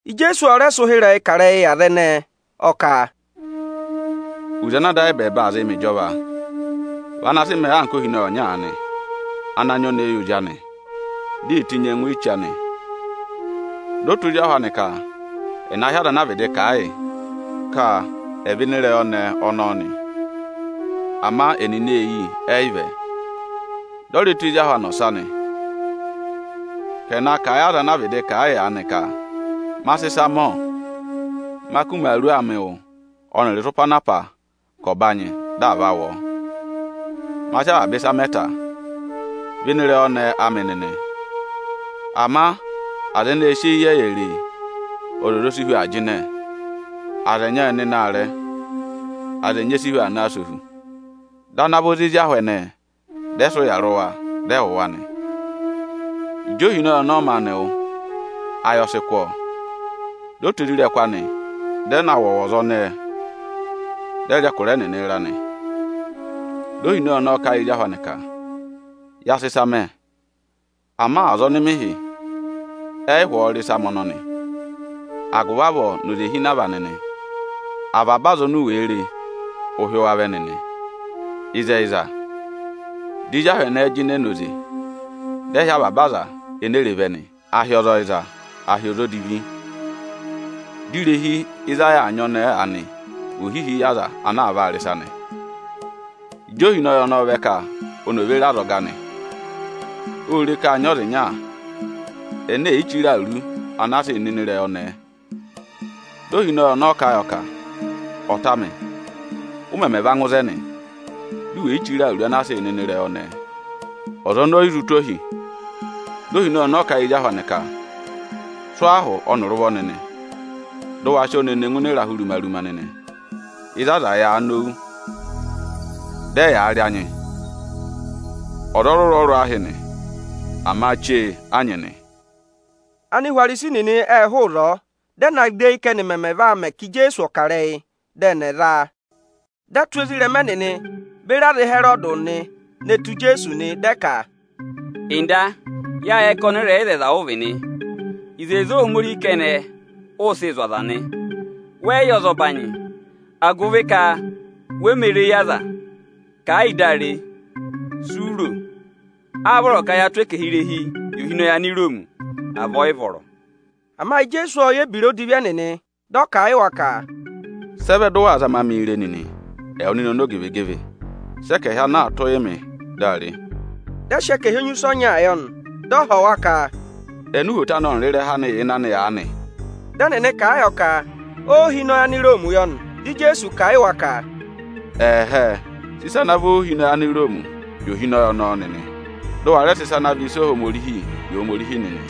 Ijeesu ọ rẹ sị ụhịrẹyị kà ịrẹyị yị aza ẹnẹẹ; ọ ka: “Oze ana Ada ayị ẹbẹẹba aa zịị mẹ ịjọva, vị ana sị mẹẹ anka ohinọyị ọnya aanị, ana aa nyị ọnẹẹ yị ozi anị, di ee tenyi ẹngụ eche anị. Dị ọ tụ́ ozi ahụ anị ka ẹ̀ na hị́ aza ana a vịdị kà a yị, ka ẹ̀ vẹ ịnị ịrẹyị ọnẹẹ ọnọọ nị. Ama ẹnịnị ê yi, ẹ yị vẹ. Dị ọ rẹ tụ́ ezi ahụ anị ọsa nị, ka ẹ̀ na kà a yị aza anaa vịdị kà a yị aanị ka, ‘Ma sị ịsa mẹ, ọ! Ma kụ́ imaaru amị wụ ọnịrị ịsụpa anaa pá ka ọ̀ banyị dị à va wụ ọọ. Ma sị avaba ịsa mẹ ta; vẹ ịnị ịrẹyị ọnẹẹ amị nịnị!’ Ama aza ẹnẹẹ ê sị eyi ịyẹyẹ re e, ọzọza o si hu aa jịnẹ; aza ẹnyị ệ nọ aarẹ, aza ẹnyị e si hu aa naa sẹ ohu. Dị ana vọ za ezi ahụ ẹnẹẹ, dị ẹ sị ụya rị wa, dị ẹ wụ̀ wa nị. Ịjị ohinọyị ọnọọ maanị wụ́, ayị ọ sị kụ́ ọọ, dị ọ tụ́ isoja anị nịnị dị ẹ na wụ ọwọza ẹnẹẹ, dị ẹ rị ẹkụra ẹnịnị ịra nị. Di ohinọyị ọnọọ kà a yị ezi ahụ anị ka: ‘Ya sị ịsa mẹ, ama aza ọnị mị hị́, ẹ yị hụ ọọ rị ịsa amị ọnọnị. Agụvị avọọ nọ ozehinava nịnị; avaba aza oni u wèe re, ụ hị́ wa vẹ nịnị.’ Ịzẹyịza, di ezi ahụ ẹnẹẹ jịnẹ nọ oze, dị ẹ hị́ avaba aza enee re vẹ nị, à hị́ ọza ọyịza, à hị́ ọza odivi. Dị irehi ịzị a yà aa nyị ọnẹẹ aanị vị ohihi yị aza ana aa vaa rị ịsa nị. Ịjị ohinọyị ọnọọ vẹ ka oni ò ve re azọga anị, ô re ka â nyị ọza ịnya ene è yi chire awuru ana a sịị̄ nọ ịnị ịrẹyị ọnẹẹ. Dị ohinọyị ọnọọ kà a yọ ka: ‘Ọta amị, ụ mẹmẹ va ngụ ịzẹnị, du wè yi chire awuru anaa sịị̄ nọ ịnị ịrẹyị ọnẹẹ?’ Ọza ọnọọ ọ yị zụ tụ̀ ohi. Dị ohinọyị ọnọọ kà a yị ezi ahụ anị ka: ‘Sụ́ ọọ ahụ ọnịrị ụvọ nịnị, dị ụ wa sị ọọ ne ne ngụ ịnị ịrahụ ruma-ruma nịnị, ịzị aza yàā nowu, dị ẹyaa rị anyị.’ Ọza ọrụrụ-ọrụrụ a hị́ nị, ama chee a nyị nị.” Anihwarisi nịnị ệ hụụ ịzọọ, dị ẹ na gẹ eyi ka ẹ́nị mẹmẹ va mẹ ka Ijeesu ọ̀ kà ịrẹyị dị ẹnị ẹ̀ za a nị. Dị ẹ tụ́ ezirẹma ẹnịnị beri aza Ịhẹrọdị nịnị ne tù Ijeesu nị. Dị ẹ ka, “Ọga, yâ yẹ ka ọnịrẹyịzẹyịza ụ vị nị. Ịzẹyịza Ohomorihi kẹnẹ, ụ sịị̄ zụ̀ aza nị. Wẹ yị yẹ ọzọbanyị, agụvị ka we mē re eyi aza.” Kà ẹ yị dị a re, si u ro: “Áá vọrọ ka yaa tụ́ ẹkẹhị irehi yị ohinọyị Aniroomi, à vị ọ yị vọrọ.” Ama Ijeesu ộ yẹ ebira odivi ẹnịnị, dị ọ kà a yị wa ka, “Sị ẹ vẹ dị ụ waa zama mịị re nịnị, ẹwụ nịnị ọmọzakụyẹ? Sị ẹkẹhị ana aā tụ́ụ yị mị, dị a re!” Dị ẹ sị ẹkẹhị enyusẹ ọnyaa yọ nị. Dị ọ họ̀ wa ka, “Eni uhwoto anị ọnịrị ịrẹha anị yà ịnị anị aanị?” Dị ẹnịnị kà a yọ ka óohinọyị Aniroomi yọ nị. Dị Ijeesu kà a yị wa ka, “Ẹ̀hẹẹ, sị ịsa ana àa vị óohinọyị Aniroomi yị ohinọyị ọnọọ nịnị; dị ụ wa rẹ sị ịsa ana àa vị ịsa Ohomorihi yị Ohomorihi nịnị!”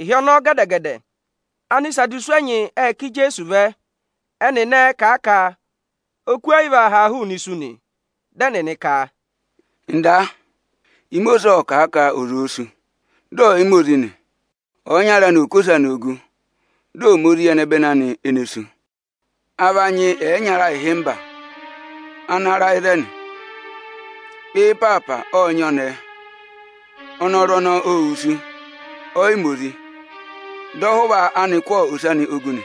Ịhị ọnọọ gẹdẹ-gẹdẹ Anisadusi ẹnyị ệ ká Ijeesu vẹ. Ẹnịnị ẹẹ̄ kà a ka oku ẹ yị vaa haa hụụnị isu nị. Dị ẹnịnị ka, “Ọga, Imosiisi ộ kà a ka ọza òo sú, dị ọ̀ yị ma ozi nị, ọyịnyara anị ọ̀ kụ́ ose anị ogu, dị ọ̀ ma ozi yị ẹnẹbẹnị anị ene sú. A va nyị ẹyịnyara ịhịmba ana ra ịzẹnị. Ana vị ọzọkụ ẹnịnị ộ nyị ọnẹẹ; ọ yị ma ozi di o sú, dị ọhụva anị kụ́ ose anị ogu nị.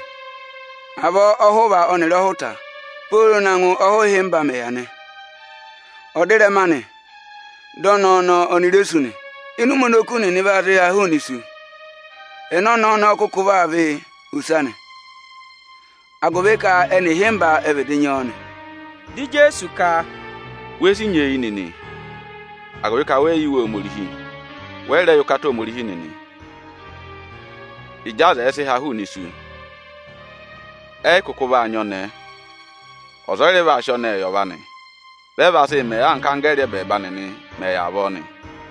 Avọọ ọhụva ọnịrị ọhụta mẹ̀ yà pooro na ngụ ọhụhịmba ẹnịnị nị. Ọdịrẹma anị dị ọnẹẹ ọnọọ oni re sú nị. Ịnị ụmẹ oni oku nịnị vaa sị haa hụụnị isu, ẹnẹ ọnẹẹ ọnọọ kụkụ vaa vị ose anị ịnị ẹnị ẹyịnyara ịhịmba ana vịdị nyị ọọ aanị?” Dị Ijeesu ka, “We si nyeeyi nịnị, agụvị ka wẹ yị yẹ Iwe Ohomorihi, wẹ yị rẹ yẹ ụkata Ohomorihi nịnị. Ịjị aza ẹ̀ẹ sị ha hụụnị isu, ọza ẹ yị kụkụ vaa nyị ọnẹẹ, ọza ọ yị rẹ vaa sị ọnẹẹ gà ọnọrụ. Vị ẹ vaa yà anka anggẹẹrị ẹbẹẹba nịnị mẹ̀ yà avọọ nị.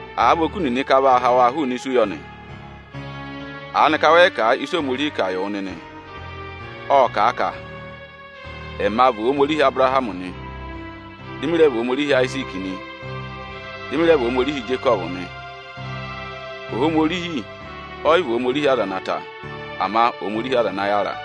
Àa vị ka a vaa ha hụụnị isu yọ, aanịka wẹẹ̀ yị kà a ịsị Ohomorihi kà yị wụ nịnị? Ộ kà a ka: ‘Ẹma vị Ohomorihi Abụrahamị nị, dị mị rẹ vị Ohomorihi Ayiziiki nị, dị mị rẹ vị Ohomorihi Ijekọvụ nị.’ Ohomorihi ọ yị vị Ohomorihi aza ene wusu, ama Ohomorihi aza ana yàra.”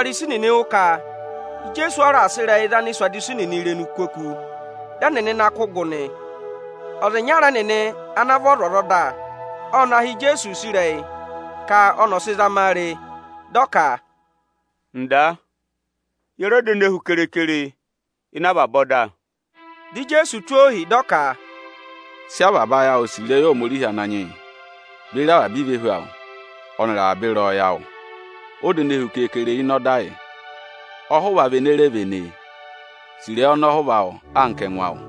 Ịjị Anihwarisi nịnị wụ́ ka Ijeesu ọ raà sị ịrẹyị za Anisadusi nịnị irenu kú oku, dị ẹnịnị na kụ́ gụ nị. Ọza ịnyara ẹnịnị ana vị ọzwọzọda, ọ na họ̀ Ijeesu use ịrẹyị ka ọnị ọ̀ sị zama a re. Dị ọ ka: “Ọga, ye re ọda ene hu kere-kere ịnị avaba ọda?” Dị Ijeesu tụ́ ọ ohi, dị ọ ka, “Sị avaba ayị awụ sì ịrẹyị Ohomorihi Ananyị yị beri avaba ivehu awụ, ọnịrị avaba ịrẹyọyẹ awụ! Ọda ene hu keekere ịnị ọda yị. Ọhụva vị ene re véné e: Sì ịrẹyị ọnọhụva awụ anka ẹngụ awụ!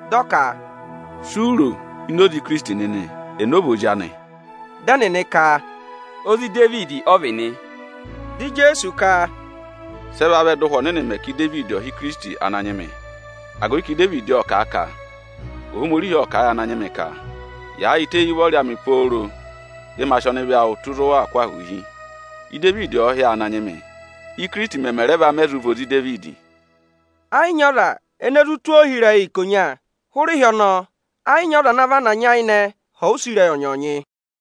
dị ọ ka, “Si u ro ini oze Ikirisiti nịnị; ẹnị ọ vị ozi anị?” Dị ẹnịnị ka, “Ozi Idevidi ọ vị nị.” Dị Ijeesu ka, “Sị ẹ vavẹ dị Ụhwẹ Ọnịnị mẹ ka Idevidi ọ̀ hị́ Ikirisiti ‘Ananyị mị’? Agụvị ka Idevidi ộ kà a ka: ‘Ohomorihi ộ kà a yị Ananyị mị ka: Yaayịtẹ éyi ụvọrị amị pooro dị ma sị ọnịvị awụ tụ́ ịzị ụ waa kụ́ ahụụ hi.’ Idevidi ọ̀ọ hị́ ọọ ‘Ananyị mị’, Íkirisiti mẹmẹ rẹ va mẹ vị ozi Idevidi?” Ẹ yị nyị ọza ene zụ tụ́ ọọ ohi ịrẹyị ikonya. Hụrẹ ịhị ọnọọ, ẹ yị nyị ọza ana vana nyayịnẹ họ̀ ọ use ịrẹyị ọnyọọnyị.